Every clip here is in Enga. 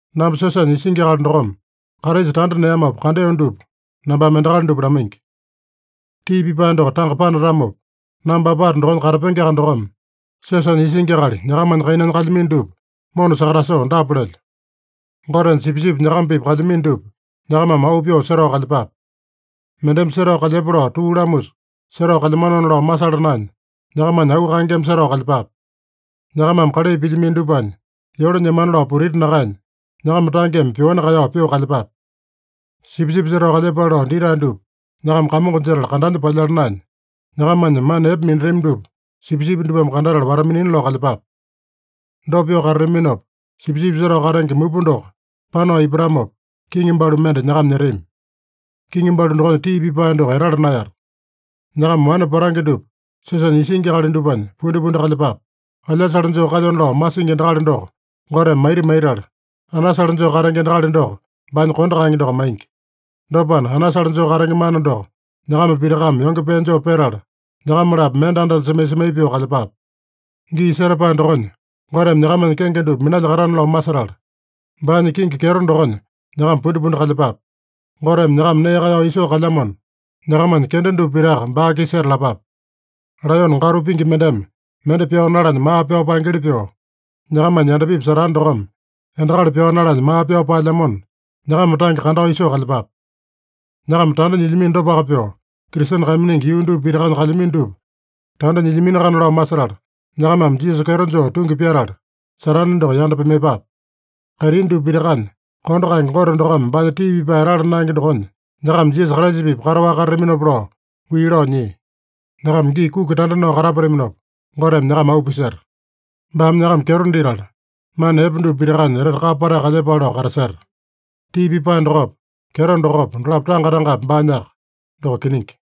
Namba siosanya isingi akali dokome, Kraisa tanda neamopa kandeo dupa nambame endakali dupa lamaingi. Tii pipae doko tanga panatamopa, namba apata dokonya katapengeaka dokome siosanya isingi akali nyakamanya kainanya kalyamino dupa mona sakatasoo dapa lelyo: Gotenya sipisipi nyakama-pipa kalyamino dupa, nyakamame auu pyoo setao kalyepape. Mendeme setao kalyepa lao tuu lamusa setao kalyamanona lao masala naenya, nyakamanya auu kaengeme setao kalyepape. Nyakamame kalai pilyamino dupanya yole nyemana lao putiti nakaenya, nyakama tangeme pyoani kaeyao pyoo kalyepape. Sipisipi setao kalyepale lao ditae dupa nyakama kamongo jetala kandanya palyala naenya, nyakamanya mana epe minatami dupa sipisipi dupame kandatala wata-minina lao kalyepape. Dopa pyoo katataminopa, Sipisipi Setao Katenge Mupa doko panao ipatamopa, kiŋi balu mende nyakama nyetami. Kiŋi balu dokonya tii pipae doko etala naeyata. Nyakama wane patange dupa siosanya isingi akali dupanya pundipundi kalyepape. “Alyasale joo kalyona lao masingi endakali doko Goteme maita maitala, anasale joo katenge endakali doko baanya kondo kaenge doko maingi.” Dopana, anasale joo katenge mana doko nyakama pitakame yonge pee joo petala, nyakama-lapo mende anda-anda semai-semai pyoo kalyepape. Gii setapae dokonya Goteme nyakamanya kenge dupa minalyakatana lao masetala, baanya kingi kyeto dokonya nyakama pundipundi kalyepape. Goteme nyakama nee kaeyao isoo kalyamona, nyakamanya kenda dupa pitaka baa-kisa setalapape. Laeyone gatu pingi mendeme mende pyao nalanya maa pyao paengeli pyoo, nyakamanya yandapipi Satane dokome endakali pyao nalanya maa pyao paelyamona, nyakama tange kandao isoo kalyepape. Nyakama tanda nyilyamino dopaka pyoo, Kristene kaiminingi yuu dupa pitakanya kalyamino dupa tanda nyilyaminoakana lao masetala, nyakamame Jisasa kyeto joo tungi pyatala, Satane doko yanda pimaiyepape. Kaitini dupa pitakanya kondo kaenge Gote dokome baanya tii pipae etala naenge dokonya nyakama Jisasa Kraisa-pipa kataowaka katataminopa lao wii lao nyia. Nyakama gii kuki tanda nao katapataminopa, Goteme nyakama auu piseta. Baame nyakama kyeto ditala, mana epe dupa pitakanya etete kapa patae kalyepale lao kataseta. Tii pipae dokopa, kyeto dokopa, dolapo tanga-tangapi baanyaka. Doko kiningi.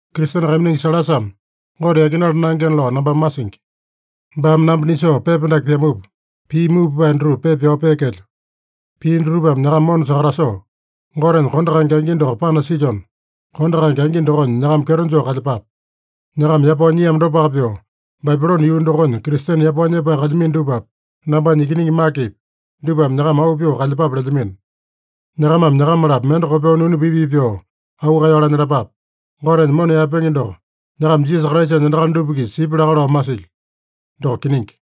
Kristene kaiminingi Sailasame Gote yakinala naengena lao nambame masingi. Baame namba nisoo pepa dake pyamupa, pii muu pipae dutupa pepa pyao peekelyo. Pii dutupame nyakama mona sakatasoo, Gotenya kondo kaenge angi doko panasilyona, kondo kaenge angi dokonya nyakama kyeto joo kalyepape. Nyakama yapao nyiamo dopaka pyoo, Babilone yuu dokonya Kristene yapao nyepae kalyamino dupapi, nambanya ikiningi Makepi, dupame nyakama auu pyoo kalyepape lelyamino. Nyakamame nyakama-lapo mende kopyoo nunu pii-pii pyoo auu kaeyao lanyalapape. Gotenya mona yaepenge doko nyakama Jisasa Kraisanya endakali dupa-kisa sipya laka lao masilyo. Doko kiningi.